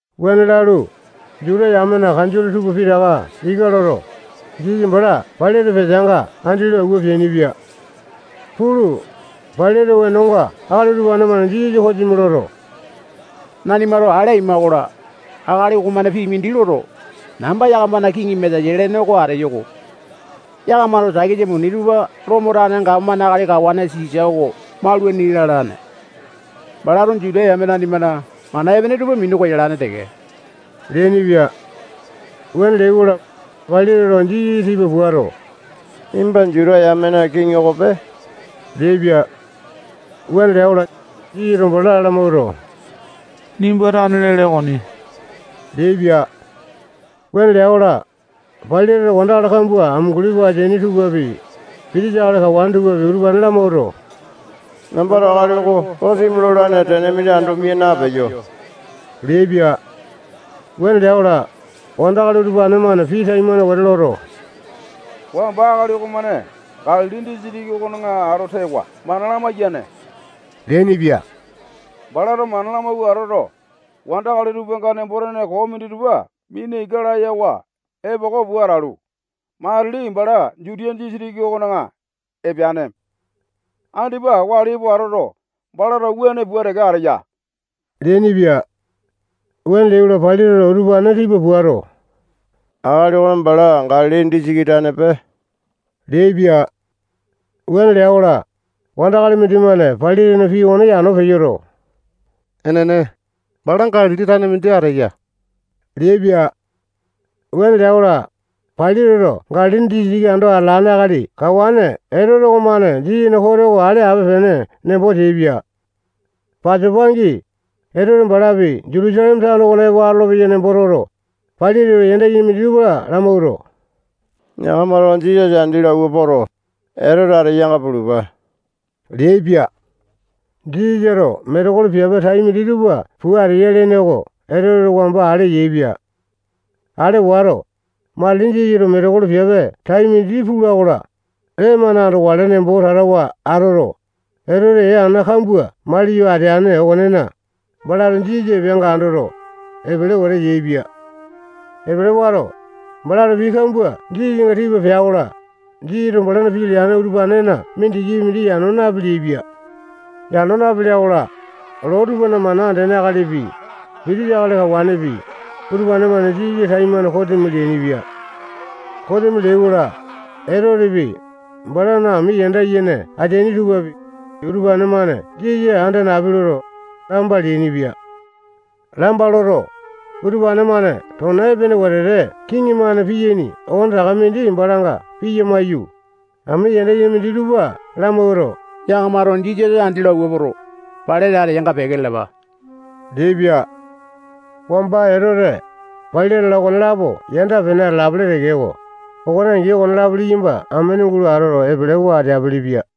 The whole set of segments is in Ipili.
Wuane lalu, Juta yamena kanjole tupa pitaka ika loto, Jisasa bala Pailate peteanga andi lo awua peainipia. Pulu, Pailate wenonga akali utupane-mane Jisasa kosimi loto, nanimato ale aima-kola, akali okomane pii mindi loto, namba yakamana kiŋi Mesaya lene oko ateyo-ko. Yakamato takisa muni tupa Lomo tane gapomane akali kawane Sisa oko maulaini lalane. Balato Juta yame nanimana mana epene tupa minu koyalane teke leainipia. Wuane leai-kola, Pailateto Jisasa tipa puato, nimba Juta yamena kiŋi okope leaipia. Wuane lea-kola, Jisasato bala lamawuato, nimba tane lele okoni leaipia. Wuane lea-kola, Pailateto wandakali kambua amunguli pua ateaini tupapi, pitisa akali kawane tupapi, utupane lamawuato, nambato akali oko kosimi lolane tene mindi ando mia napeyo leaipia. Wuane lea-kola, wandakali utupane-mane pii taimane wete loto, wamba akali okomane Galili disitiki okona ato tewa mana lamaiyane leainipia. Balato mana lamawua atoto, wandakali tupanga nembo-tene koo minditupa mina ika layawa epoko pua atalu, matili bala Jutiya disitiki okona epeane. Andipa wali epo atoto, balato wuane pua teke ateya leainipia. Wuane leai-kola, Pailateto utupane tipa puato, akali oko bala Galili disitiki tanepe leaipia. Wuane lea-kola, wandakali mindimane Pailatena pii okone yano peyoto, enene, bala Galili tane mindi ateya leaipia. Wuane lea-kola, Pailateto Galili disitiki ando atalane akali kawane Etote okomane Jisasana kote oko ale ape-pene nembo teaipia. Pasopa angi, Etote balapi Jutusaleme tano okona epo atolopeya nembo toto, Pailateto yanda yene minditupa lamawuato, yakamato Jisasa andi lo awua poto, Etote ateyanga pulupa leaipia. Jisasato metekolo piape tai minditupa pua ateya lene oko Etoteto wamba ale yaepia. Ale wato, matili Jisasato metekolo piape tai mindi pula-kola, lee-mane andokale nembo tatawa atoto, Etoteto ee ana kambua maliyo ateane okonena, balato Jisasa epeanga andoto, epele wete yaepia. Epele wato, balato pii kambua Jisasanga tipa pea-kola, Jisasato balana pii leane utupanena mindikipi mindi yano napeleai-pia. Yano napelea-kola, loo tupana mana andene akalipi, pitisa akali kawanepi, utupane-mane Jisasa taimane kosimi leainipia. Kosimi leai-kola, Etotepi, balana ami yanda yene ateaini tupapi, utupane-mane Jisasa anda napi loto, lamba leainipia. Lamba loto, utupane-mane tona epene wetete kiŋi-mane piyaini okonetaka mindi balanga piya maiyu, ami yanda yene minditupa lamawuato, yakamato Jisasa andi lo awua poto, Pailate ateyanga peke lalapa leaipia. Wamba Etote, Pailate-la, okonelapo yanda-pene atalapele tekeko, Okone angi, okonelapo liyamba amene gulo atoto, epelewa ateapele-pia.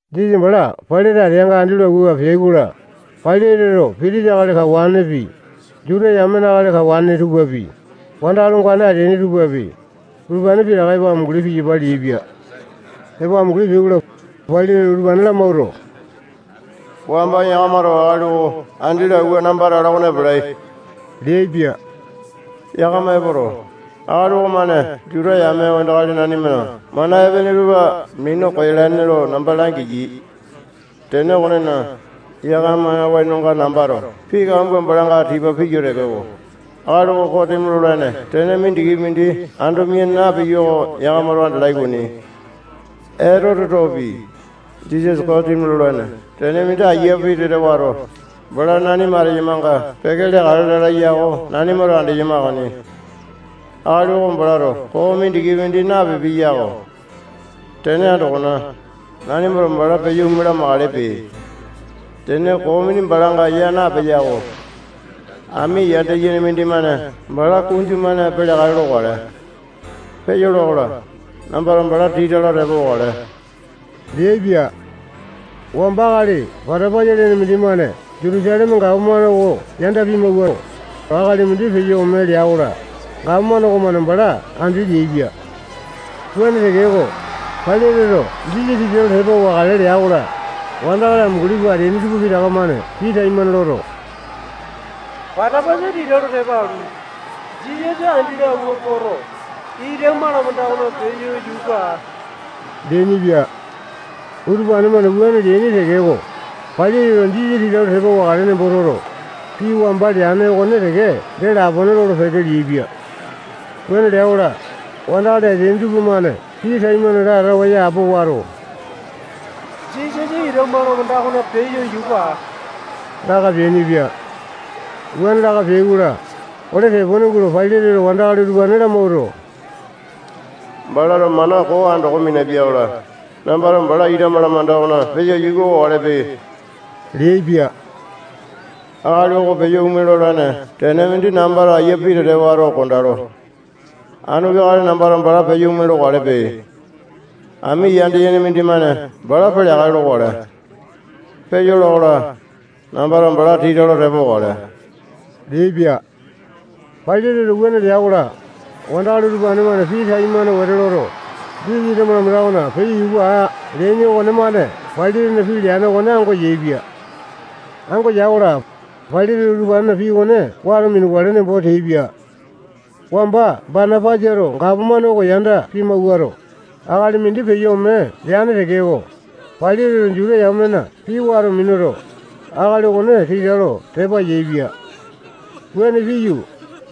Jisasa bala Pailate ateanga andi lo awua peai-kola, Pailateto pitisa akali kawanepi, Juta yamena akali kawane tupapi, wandakali ongane ateaini tupapi, utupane pitaka epo amunguli piyapa leaipia. Epo amunguli peai-kola, Pailateto utupane lamawuato, wamba yakamato akali oko andi lo awua namba atalo okona ipupia leaipia. Yakama epoto, akali okomane Juta yame wandakali nanimana mana epene tupa minu koyalane lo namba langiyai. Tene okonena, yakamana wenonga nambato pii kambua balanga tipa piyo tekeko, akali oko kosimi lolane tene mindikipi mindi ando mia napiyo oko yakamato andalai okoni. Etotetopi, Jisasa kosimi lolane tene mindi ayia pitete wato, bala nanima ateyamanga peke leakale lala ya oko nanimato andeyama okoni. Akali oko balato koo mindikipi mindi napipiya yako. Tene andokona, nanimato bala peyo ome lamakalepe. Tene koo mindi balanga ya napeya-ko. Ami yanda yene mindimane bala kunju-mane peleakale lokale. Peyola-kola, nambato bala tita lo tepa wakale leaipia. Wamba akali Batapasa lene mindimane Jutusaleme gapomane oko yanda pimawuato, akali mindi peyo ome lea-kola, gapomane okomane bala andi leaipia. Wuane tekeko, Pailateto Jisasa tita lo tepa wakale lea-kola, wandakali amunguli pua ateaini tupa pitaka-mane pii taimane loto, Batapasa tita lo tepa alu, Jisasa andi lo awua poto, ita malamanda okona peyo yuka aa leainipia. Utupane-mane wuane leaini tekeko, Pailateto Jisasa tita lo tepa wakale nembo toto, pii wamba leane okone teke dee lapone lolo-peke leaipia. Wuane lea-kola, wandakali ateaini tupamane pii taimane latawa yapo wato, Jisasa ita malamanda okona peyo yuka aa laka peainipia. Wuane laka peai-kola, ole tepone gulo Pailateto wandakali utupane lamawuato, balato mana koo andoko minapia-kola, nambato bala ita malamanda okona peyo yuka wakalepe leaipia. Akali oko peyo ome lolane tene mindi nambato ayia pitete wato kondalo. Anu peakale nambato bala peyo ome lokalepe. Ami yanda yene mindimane bala peleakale lokale. Peyola-kola, nambato bala tita lo tepa wakale leaipia. Pailateto wuane lea-kola, wandakali utupane-mane pii taimane wete loto, Jisasa ita malanda okona peyo yuka aa leaini okonemane Pailatena pii leane okone ango yaepia. Ango yai-kola, Pailateto utupanena pii okone wato minukale nembo teaipia. Wamba Batapasato gapomane oko yanda pimawuato, akali mindi peyo ome leane tekeko, Pailateto Juta yamena pii wato minuto, akali okone tita lo tepa yaepia. Wuane piyu,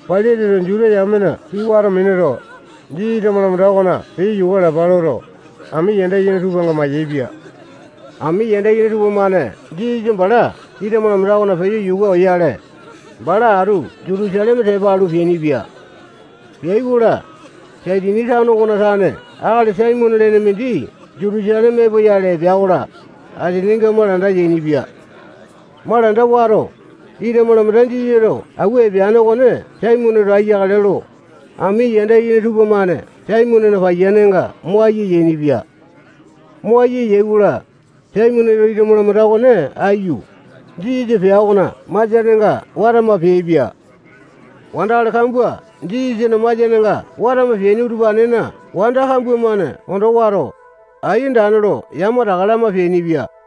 Pailateto Juta yamena pii wato minuto, Jisasa ita malamanda okona peya yuka alapa loto, ami yanda yene tupanga mayaepia. Ami yanda yene tupamane Jisasa bala ita malamanda okona peyo yuka oyale, bala atu Jutusaleme tepa alu, peainipia. Peai-kola, Saitini tano okona tane akali Saimone lene mindi Jutusaleme epoyale epea-kola, asininga malanda yainipia. Malanda wato, ita malamanda Jisasato awua epeane okone Saimoneto aiyakale lo, ami yanda yene tupamane Saimonena paiyanenga mo ayia yainipia. Mo ayia yai-kola, Saimoneto ita malamanda okone aiyu, Jisasa pea okona masianenga watama peaipia. Wandakali kambua Jisasana masianenga watama peaini utupanena wanda kambua-mane ondo wato, ai andane lo yamataka lama peainipia.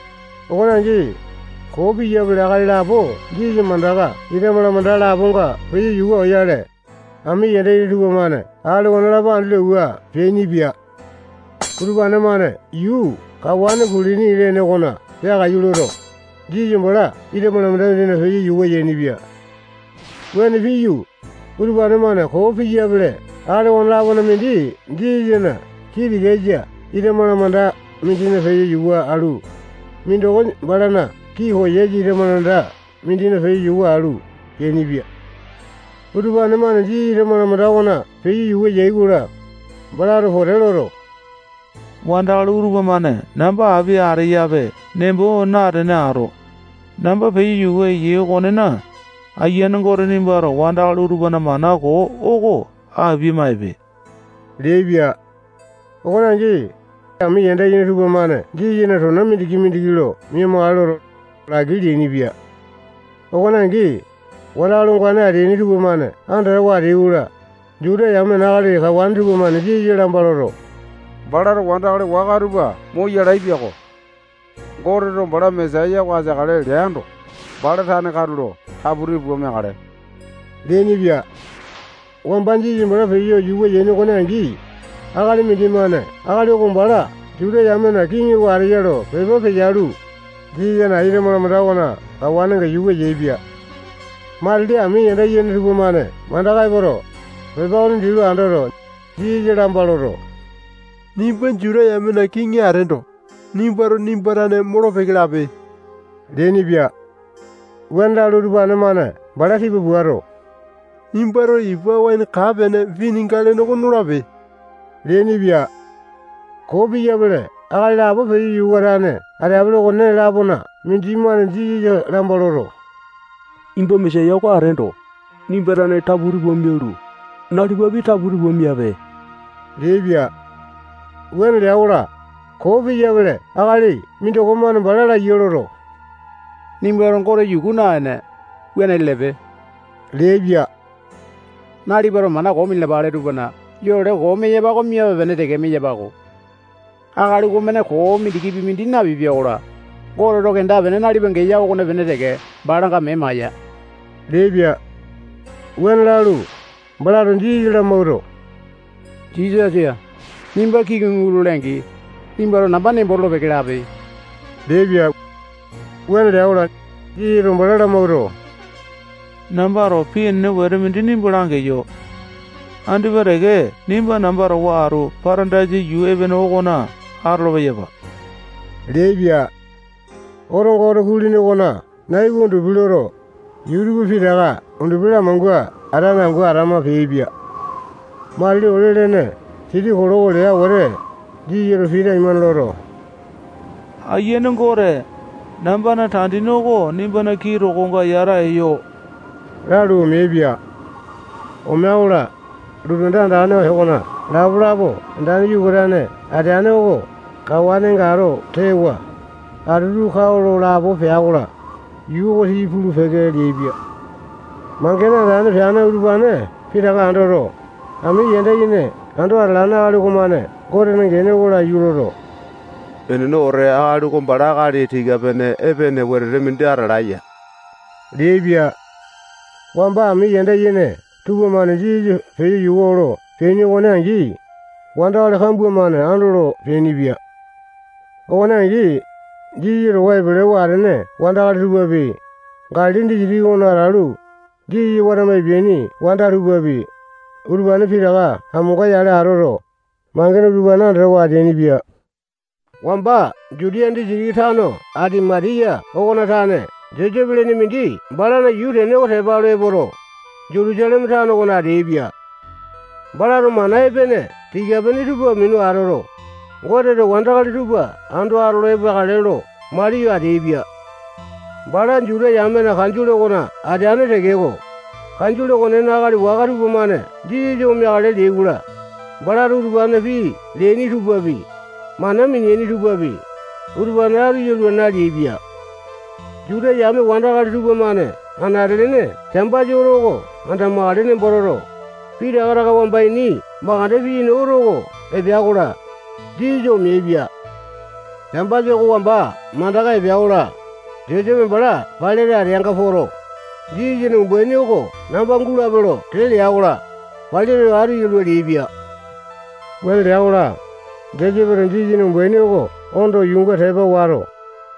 Okone angi, koo piyapele akali lapo Jisasa mandaka ita malamanda laponga peyo yuka oyale, ami yanda yene tupamane akali okonelapo andi lo awua peainipia. Utupane-mane yuu kawane kulini lene okona peakaiyu loto, Jisasa bala ita malamanda mindina peyo yuka yainipia. Wuane piyu, utupane-mane koo piyapele akali okone-lapona mindi Jisasana kii tikasa ita malamanda mindina peyo yuka alu, mindoko balana kii koyasa ita malamanda mindina peyo yuka alu peainipia. Utupane-mane Jisasa ita malamanda okona peyo yuka yai-kola, balato pote loto, wandakali utupa-mane namba api ateyape nembo natene ato, namba peyo yuka eyai okonena, Ayiane Gote nimbato wandakali utupana mana koo oko apia-maipe leaipia. Okone angi, ami yanda yene tupamane Jisasana tona mindiki-mindiki lo mia-makale loto, laki leainipia. Okone angi, wandakali ongane ateaini tupamane andatawa ateai-kola, Juta yamena akali kawane tupamane Jisasa lamba loto, balato wandakali waka tupa moyalae piako. Goteto bala Mesaya oko ateakale lea yando, bala tane katulo taputi pua meakale leainipia. Wamba Jisasa bala peyo yuka yaini okone angi, akali mindimane akali oko bala Juta yamena kiŋi oko ateya lo pepa peyalu, Jisasana ita malamanda okona kawanenga yuka yaepia. Matili ami yanda yene tupamane mandaka epoto, pepa okone dii lo andoto, Jisasa lamba loto, nimba Juta yamena kiŋi ateendo, nimbato nimba tane molo-peke lape leainipia. Wuane lalu, utupane-mane bala tipa puato, nimbato ipa waene kaa-pene pinika lene oko nolape leainipia. Koo piyapele akali lapo peyo yuka atane ateapele okone-lapona mindimane Jisasa lamba loto, nimba Mesaya oko ateendo, nimba tane taputi pua mialu, nalipapi taputi pua miape leaipia. Wuane lea-kola, koo piyapele akali mindoko-mane bala laiya loto, nimbato Gote yuku naene, wuane lelepe leaipia. Nalipato mana koo minalapele tupana yole koo meyapa oko miape-pene teke meyapa-ko. Akali okomane koo mindikipi mindi napipia-kola, Goteto kenda-pene nalipa geya okopene teke balanga mee maiya leaipia. Wuane lalu, balato Jisasa lamawuato, Jisasa, nimba kiŋi gulole-angi, nimbato namba nembo tolo-peke lape leaipia. Wuane lea-kola, Jisasato bala lamawuato, nambato pii enene wete mindi nimba langeyo. Andipa teke nimba namba towa atu Patandaisa yuu epene okona atolo-peyapa leaipia. Otonga oto kulini okona nai oko undupi loto, yuu tupa pitaka undupi lamangua atane angu atama peaipia. Matili ole-lene siti kiloko lea wete, Jisasato pii taimane loto, Aiyane Gote, nambana tandini oko nimbana kii tokonga yata eyo lalu, omeaipia. Omea-kola, lotu anda andane okona lapa-lapa andane yuka atane ateane oko kawanenga ato tewa, atutu kao lo lapo pea-kola, yuu oko tii pulu-peke leaipia. Mangene andane peane utupane pitaka andoto, ami yanda yene ando atalane akali okomane Gotena gene oko laiyu loto, enene wete, akali oko bala akali tika-pene epene wetete mindi atalaeya leaipia. Wamba ami yanda yene tupamane Jisasa peyo yuka olo peaini okone angi, wandakali kambua-mane andolo peainipia. Okone angi, Jisasa towa epelewa atene wandakali tupapi, Galili disitiki okona atalu, Jisasa watama epeaini wanda tupapi, utupane pitaka amonga-yale atoto, mangene utupane andatawa ateainipia. Wamba Jutiya disitiki tano Atimatiya okona tane Josepe lene mindi balana yuu tene okone tepa alu epoto, Jutusaleme tano okona ateaipia. Balato mana epene tika-pene tupa minu atoto, Goteto wandakali tupa ando atolo epeakale lo maliyo ateaipia. Bala Juta yamena kanjole okona ateane tekeko, kanjole okonena akali waka tupamane Jisasa omeakale leai-kola, balato utupanena pii leaini tupapi, mana mineaini tupapi, utupane atu yalua naleaipia. Juta yame wandakali tupamane anate-lene Sambasa oto oko andamakale nembo toto, pitaka taka wamba ini mandeke piyaini oto oko epea-kola, Jisasa omeaipia. Sambasa oko wamba mandaka epea-kola, Josepe bala Pailate ateanga poto, Jisasana umbaini oko namba gulape lo tee lea-kola, Pailateto atu yalua leaipia. Wuane lea-kola, Josepeto Jisasana umbaini oko ondo yuunga tepa wato,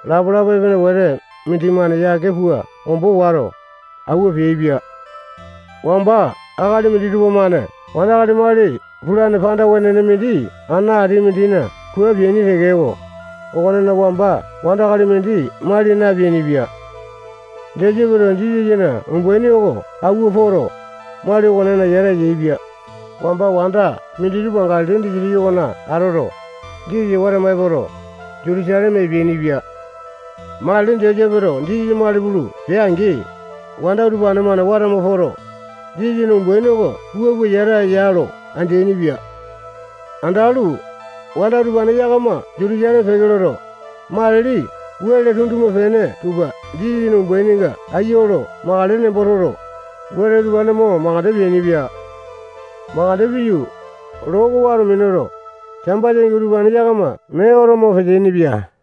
lapa-lapa epene wete mindimane yake pua ombo wato, awua peaipia. Wamba akali minditupa-mane wandakali mali pulane panda wenene mindi ana ati mindina kua peaini tekeko, okonena wamba wandakali mindi mali napeainipia. Josepeto Jisasana umbaini oko awua poto, mali okonena yata yaepia. Wamba wanda minditupa Galili disitiki okona atoto, Jisasa watama epoto, Jutusaleme epeainipia. Matili Josepeto Jisasa mali pulu pea-angi, wanda utupane-mane watama poto, Jisasana umbaini oko wua pua yata ya lo andeaini-pia. Andalu, wanda utupane yakama Jutusaleme peke loto, matili wele tunduma-pene tupa Jisasana umbaininga ayia olo makale nembo toto, wele utupane mo mandeke peainipia. Mandeke piyu, loo oko wato minuto, Sambasa angi utupane yakama mee oto mo peteaini-pia.